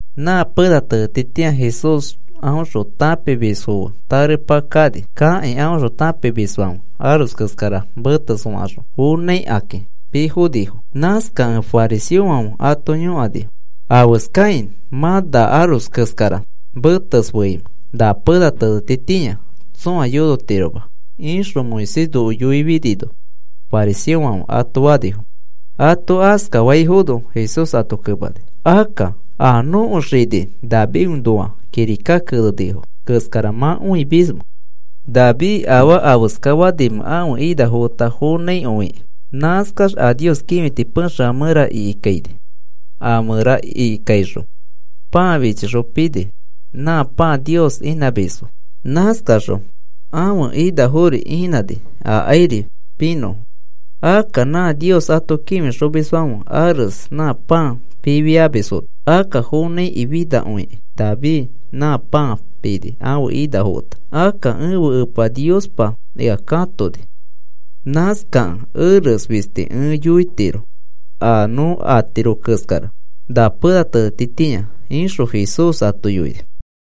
Nã pena tenetitĩa Jesús aõxõ tãpimisfo fe tarepa kani. Kakĩ aõxõ tãpimisfãfe aros keskara meteskaxõ fonãikakĩ piifonifo. Nãskakẽ fariseofãfe ato yõkanifo: “¿Afeskakĩ mã na aros keskara metesfeimẽ na pena tenetitĩa tsõa yonotiroma ixõ Moisés noko yoifinino?” fariseofãfe ato fanifo. Ato askafaifono Jesús ato kemani, “Akka, ¿a nõko xini Davidõnoa kirika kenenifo keskara mã õimismẽ David afaa afeska fanimẽ ãfe inafo feta fonãikõi? Nãskax a Nios kĩfiti pexefã mẽra ikikaini. A mẽra ikikaixõ pãa fichixõ pini, nã pãa Nios inãmisfo. Nãskaxõ ãfe inafori inãni akairi pinõfo, akka nã Nios ato kĩfixomisfãfe ares nã pãa pifiamisfono. Akka fonãikĩ finakõikĩ David nã pãa pini ãfe inafo feta. Akka ẽfe Epa Niospa ea katoni. Nãskakẽ eres fisti ẽ yoitiro a nõ atiro keskara na pena tenetitĩa,” ixõ Jesús ato yoini.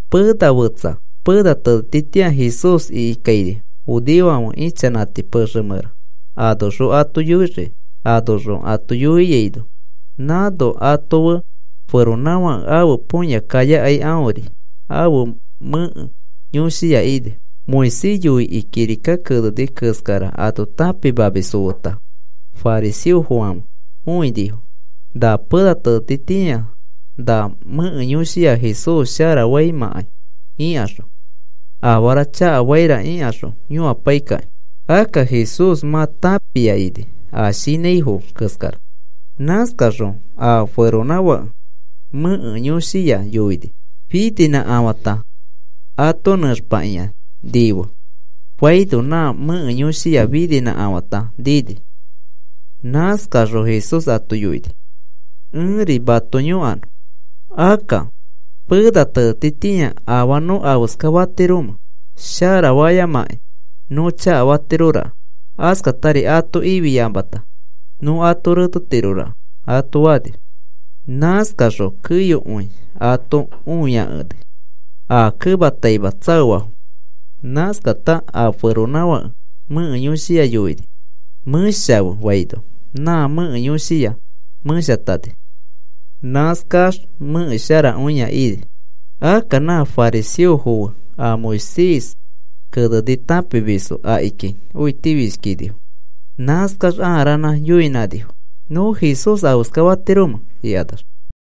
Pena fetsa pena tenetitĩa Jesús ikikaini judeofãfe ichanãti pexe mẽra anoxõ ato yoixiki. Anoxõ ato yoiaino, nãno ato fe feronãfake ãfe põya kayakai aõri ãfe mẽke yõshiya ini. A Moisés yoikĩ kirika keneni keskara ato tãpimamisfo feta fariseofãfe õinifo, na pena tenetitĩa na mẽke yõshiya Jesús sharafaimãkai ikaxõ, afara chakafaira ixõ yõapaikakĩ. Akka Jesús mã tãpia ini a shinãifo keskara. Nãskaxõ a feronãfake mẽke yõshiya yoini: “Fininãkafãta ato nẽxpakĩa nife,” faino, nã mẽke yõshiya fininãkafãta niini. Nãskaxõ Jesús ato yoini: “Ẽri mato yõkanõ. Akka, ¿pena tenetitĩa afaa nõ afeskafatiromẽ, shara fayamakĩ nõ chakafatiroraka? Askatari ato ifiyamata, nõ ato retetiroraka,” ato fani. Nãskaxõ keyokõi ato õiakeni, a kemataima tsaoafo. Nãskata a feronãfake mẽke yõshiya yoini: “Mẽshafe,” faino nã mẽke yõshiya meshatani. Nãskax mẽke sharakõia ini. Akka nã fariseofo fe a Moisés keneni tãpimisfo akiki õitifishkinifo. Nãskax ãa ranã yoinãnifo: “¿Nõ Jesús afeskafatiromẽ?” ikanax.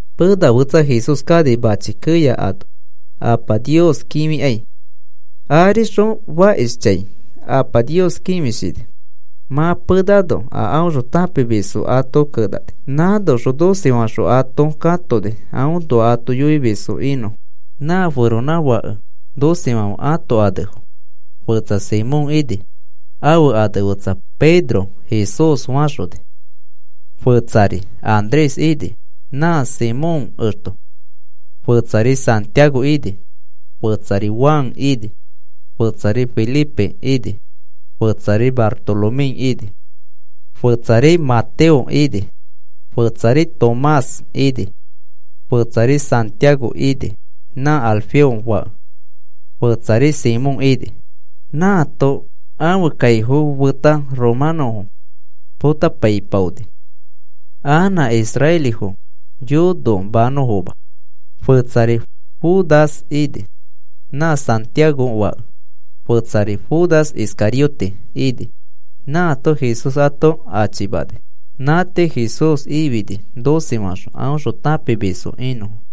Pena fetsa Jesús kani mãchi keya ano Apa Nios kĩfikai. Arixõ fakishchãi Apa Nios kĩfishini. Mã penano a aõxõ tãpimisfo ato kenani. Nãnoxõ doce faxõ ato katoni, aõnoa ato yoimisfo inõfo. Nã feronãfake docefãfe ãto anefo fetsa Simón ini, ãfe ane fetsa Jesús faxoni Pedro fakĩ; fetsari Andrés ini, nã Simón exto; fetsari Santiago ini; fetsari Juan ini; fetsari Felipe ini; fetsari Bartolomé ini; fetsari Mateo ini; fetsari Tomás ini; fetsari Santiago ini, nã Alfeo fake; fetsari Simón ini. Nãato ãfe kaifo feta romanõfo potapaipaoni, anã israelifo yonomanõfoma. Fetsari Judas ini, nã Santiago fake; fetsari Judas Iscariote ini, nãato Jesús ato achimani. Nã tii Jesús ifini doce faxõ aõxõ tãpimisfo inõfo.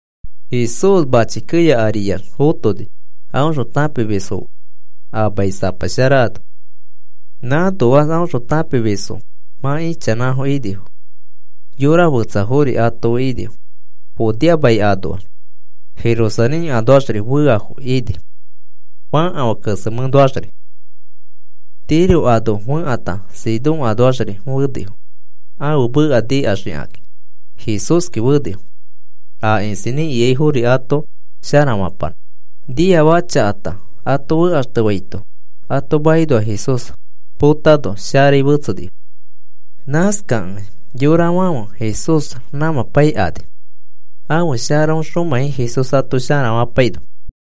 Jesús mãchi keya ariax fotoni, aõxõ tãpimisfo fe a mai sapa shara ano. Nãnoax aõxõ tãpimisfo mã ichanãfo inifo. Yora fetsafori ato fe inifo, Judea mai anoax, Jerusalén anoaxri feafo ini fãkafã kesemẽnoaxri. Tiro anoa fekãta Sidón anoaxri fenifo. Ãfe meka nikaxikakĩ Jesúski fenifo, aa isinĩ ikaifori ato sharafapanõ. A niafaka chakata ato fekaxtefaito ato makinoa Jesús potano sharai fetsenifo. Nãskakẽ yorafãfe Jesús ramãpaikani, ãfe sharaõxomãi Jesús ato sharafapaino.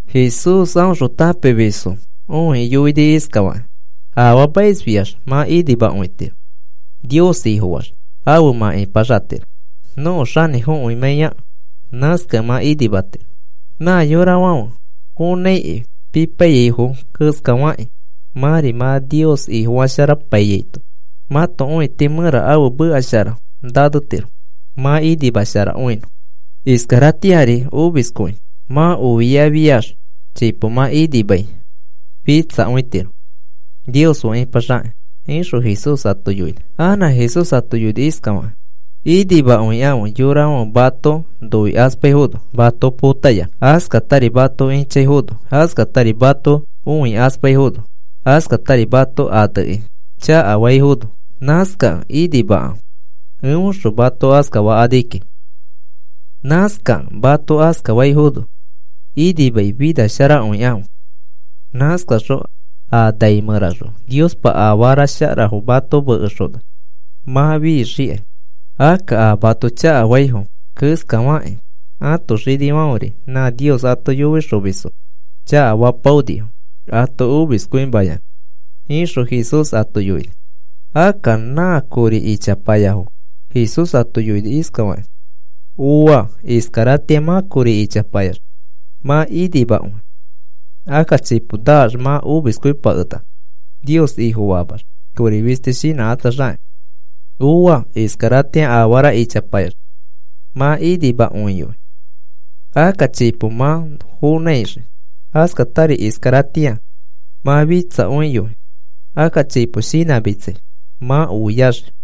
Jesús aõxõ tãpimisfo õikĩ yoini iskafakĩ: “Afaamaisfiax mã inimakõitiro. Nios Ifofaax afe mã ipaxatiro nõko xanĩfokõimãiyakẽ. Nãskakẽ mã inimatiro. “Nã yorafãfe fonãikĩ pipaiyaifo keskafakĩ mãri mã Nios Ifofasharakõipaiyaito mãto õiti mẽra ãfe meka shara nanetiro, mã inimasharakõinõ. Iskaratĩari omiskõi mã oiafiax chipo mã inimai fitsakõitiro Nios fe ipaxakĩ,” ixõ Jesús ato yoini. Anã Jesús ato yoini: “Inimakõikãfe yorafãfe mato noikaspaifono mato potayanã. Askatari mato ĩchaifono, askatari mato õikaspaifono askatari mato anekĩ chakafaifono. nãskakẽ inimakãfe eõxõ mato askafakani kiki. Nãskakẽ mato askafaifono inimai finasharakõikãfe. Nãskaxõ a nai mẽraxõ Niospa afara sharafo mato mekexona mã fixikai. Akka nã mato chakafaifo keskafakĩ ãto xinifãferi nã Nios ato yoixomisfo chakafapaonifo ato omiskõimayanã,” ixõ Jesús ato yoini. Akka nã kori ichapayafo Jesús ato yoini iskafakĩ: “Ooa. Iskaratĩa mã kori ichapayax mã inimakõi. Akka chipo naax mã omiskõipakenaka, Nios Ifofamax kori fisti shinãkatsaxakĩ. “Ooa. Iskaratĩa afara ichapayax mã inimakõiyoi; akka chipo mã fonãixii. Askatari iskaratĩa mã fitsakõiyoi; akka chipo shinãmitsai mã oiaxii.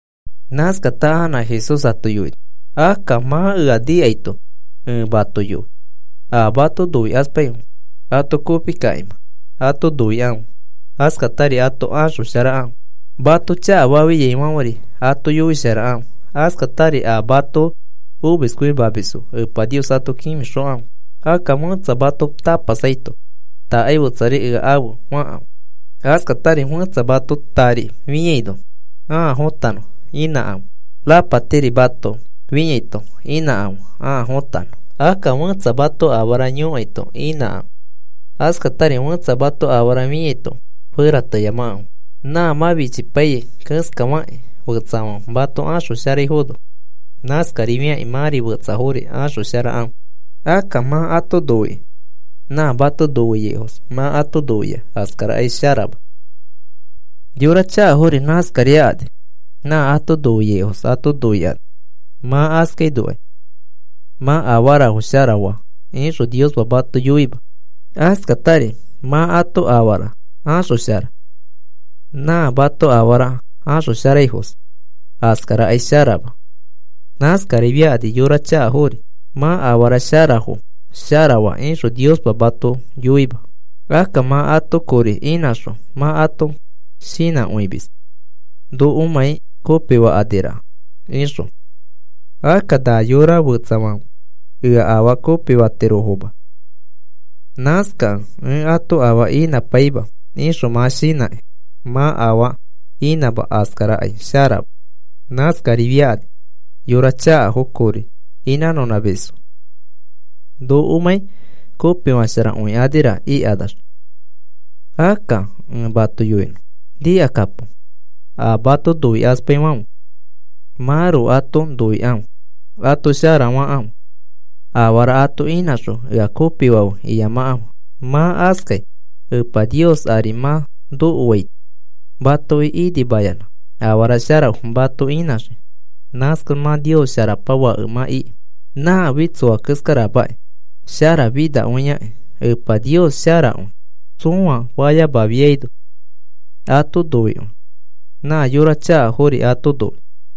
Nãskata anã Jesús ato yoini: “Akka mã ea nikaito ẽ mato yoi. A mato noikaspaifo ato kopikima ato noikãfe. Askatari ato axosharakãfe. Mato chakafaifãferi ato yoisharakãfe. Askatari a mato omiskõimamisfo Epa Nios ato kĩfixokãfe. Akka fẽtsa mato tapasaito, ‘Takai fetsari ea afe,’ fakãfe. Askatari fẽtsa mato tari fĩaino ãa fotanõ inãkãfe, rapatiri mato fĩaito inãkãfe ãa fotanõ. Akka fẽtsa mato afara yõkaito inãkãfe. Askatari fẽtsa mato afara fĩaito ferateyamakãfe. Nã mã fichipaiyai keskafakĩ fetsafãfe mato axosharaifono, nãskarifiakĩ mãri fetsafori axosharakãfe. “Akka mã ato noikĩ nã mato noiaifos mã ato noia, askarakai sharama. Yora chakafori nãskariakani; nã ato noiaifos ato noikani. Mã askainokai, ‘Mã afarafo shara faa,’ ixõ Niospa mato yoima. Askatari mã ato afara axoshara nã mato afara axosharaifos, askarakai sharama. Nãskariakani yora chakafori. ‘Mã afara sharafo shara faa,’ ixõ Niospa mato yoima. Akka mã ato kori inãxõ mã ato shinãkõimis nokomãi kopifakõikanira ixõ; akka na yora fetsafãfe ea afaa kopifatirofoma. Nãskakẽ ẽ ato afaa inãpaima ixõ mã shinãkĩ mã afaa inãma, askara sharama. Nãskarifiakani yora chakafo kori inãnõnãmisfo nokomãi kopifasharakõikanira ikanax. Akka ẽ mato yoinõ, nikakapo. A mato noikaspaifãfe mãroko ato noikãfe, ato shara fakãfe. Afara ato inãxõ ea kopifafe iyamakãfe. Mã askai Epa Nios ari mã nokoaito matoki inimayanã afara sharafo mato inãxii. Nãskax mã Nios Sharapa fake mã iki. Nãfi tsoa keskaramãki sharafinakõiaki. Epa Nios sharakõi tsõa fayamafiaino ato noikõi. Nã yora chakafori ato noi.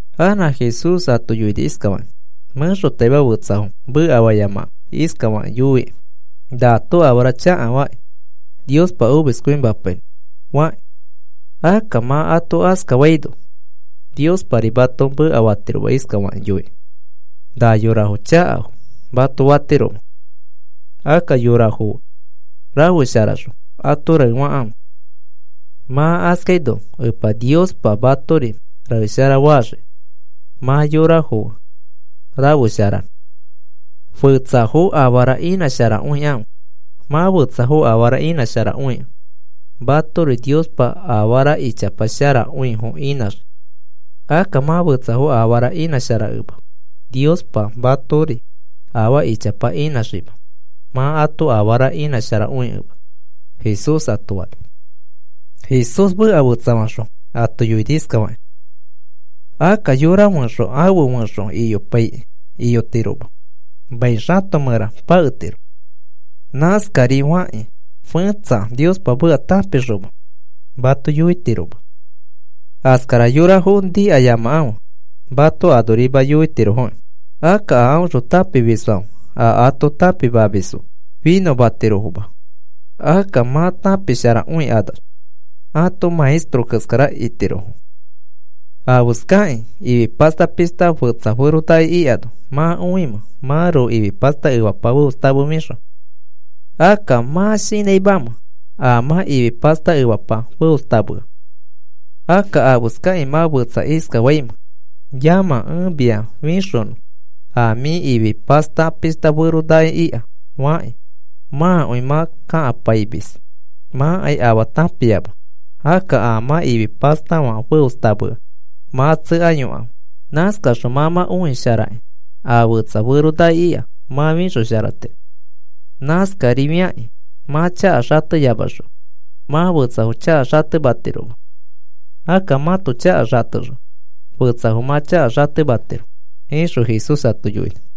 Anã Jesús ato yoini iskafakĩ: “Mẽxotaima fetsafo mekafayamakãfe iskafakĩ yoikĩ: ‘Nato afara chakafakĩ Niospa omiskõimapainõ,’ fakĩ. Akka mã ato askafayamaino Niospari mato mekafatiroma iskafakĩ yoikĩ: ‘Na yorafo chakafo,’ mato fatiroma. Akka yorafo fe rafesharaxõ ato raefakãfe. Mã askaino Epa Niospa matori raeshara faxii mã yorafo fe rafesharano. Fetsafo afara inãsharakõikãfe. Mã fetsafo afara inãsharakõikẽ, matori Niospa afara ichapa sharakõifo inãxii. Akka mã fetsafo afara inãsharakẽma Niospa matori afaa ichapa inãxima, mã ato afara inãsharakõikẽma,” Jesús ato fani. Jesús meka fetsafaxõ ato yoini iskafakĩ: “Akka yora fẽxo afe fẽxo iyopaikĩ iyotiroma, mai xato mẽra paketiro. Nãskari fakĩ fẽtsa Niospa meka tãpixoma mato yoitiroma. Askara yorafo yoiyamakãfe, mato anorima yoitirofoki. Akka a aõxõ tãpimisfãfe a ato tãpimamis finõtirofoma. Akka mã tãpisharakõikanax ãto maestro keskara itirofo. “¿Afeskakĩ ifi pasta pishta fetsa feronaki ikano mã õimẽ, mãroko ifi pasta efapa feostamefixõ? Akka, ¿mã shinãimamẽ a mã ifi pasta efapa feostamea? Akka afeskakĩ mã fetsa iskafaimẽ: ‘Yamã, ẽ mia fixonõ a mĩ ifi pasta pishta fero naki ika,’ fakĩ, mãkõi mã kakamepaimis. Mãkai afaa tãpiama. Akka a mã ifi pastafã feostamea mã tsekayokãfe. Nãskaxõ mã mã õisharakĩ a fetsa feronaki ika mã fixosharatiro. Nãskari fakĩ mã chaka xateyamaxõ mã fetsafo chaka xatematiroma. Akka mãto chaka xatexõ fetsafo mã chaka xatematiro,” ixõ Jesús ato yoini.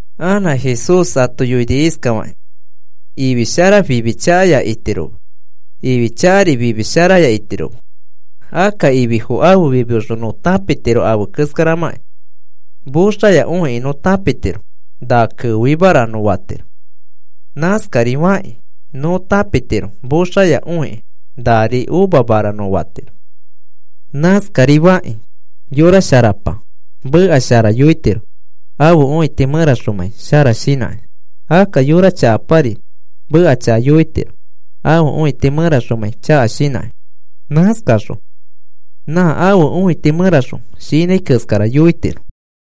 Anã Jesús ato yoini iskafakĩ: “Ifi shara fimi chakaya itiroma. Ifi chakari fimi sharaya itiroma. Akka ififo ãfe fimioxõ nõ tãpitiro afe keskaramãkĩ. Moxaya õikĩ nõ tãpitiro. Na keoimara nõ fatiro. Nãskari fakĩ nõ tãpitiro moxaya õikĩ, nari uvamara nõ fatiro. Nãskari fakĩ yora sharapa meka shara yoitiro, ãfe õiti mẽraxomãi shara shinãkĩ. Akka yora chakapari meka chaka yoitiro, ãfe õiti mẽraxomãi chaka shinãkĩ. Nãskaxõ nã ãfe õiti mẽraxõ shinãi keskara yoitiro.”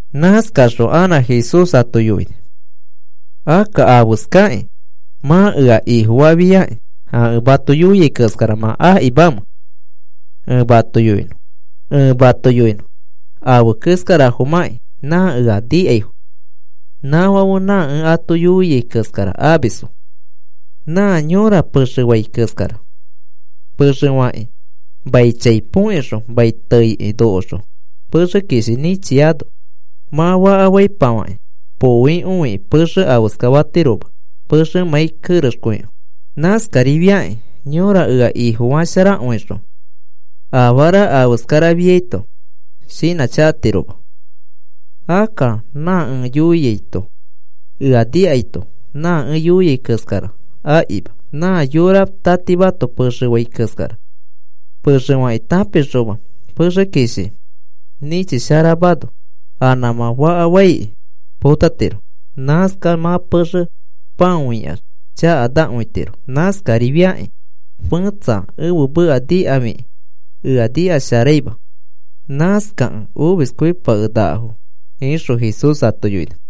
Nãskaxõ anã Jesús ato yoini: “Akka, ¿afeskakĩ mã ea Ifofafiakĩ, a ẽ mato yoiai keskara mã akimamẽ? Ẽ mato yoinõ afe keskarafomãkĩ nã ea nikaifo, nãfãfe nã ẽ ato yoiai keskara amisfo. Nã yõra pexe fai keskara, pexe fakĩ mai chai põkixõ mai teiki nokoxõ pexe kishi nĩchiano. Mã faka faikĩ faka poikõikĩ pexe afeskafatiroma pexemãi kerexkõikẽ. Nãskarifiakĩ yõra ea Ifofasharakõixõ afara afeskara afiaito shinãchakatiroma. Akka nã ẽ yoiaito ea nikaito nã ẽ yoiai keskara akima, nã yora tatimato pexe fai keskara. Pexe fakĩ tãpixoma pexe kishi nĩchisharamano, a nãmã faka faikĩ potatiro. Nãskax mã pexe pãoikax chakanakõitiro. Nãskarifiakĩ fẽtsa ẽfe meka nikafikĩ ea nikasharaima. Nãskakẽ omiskõipakenakafo,” ixõ Jesús ato yoini.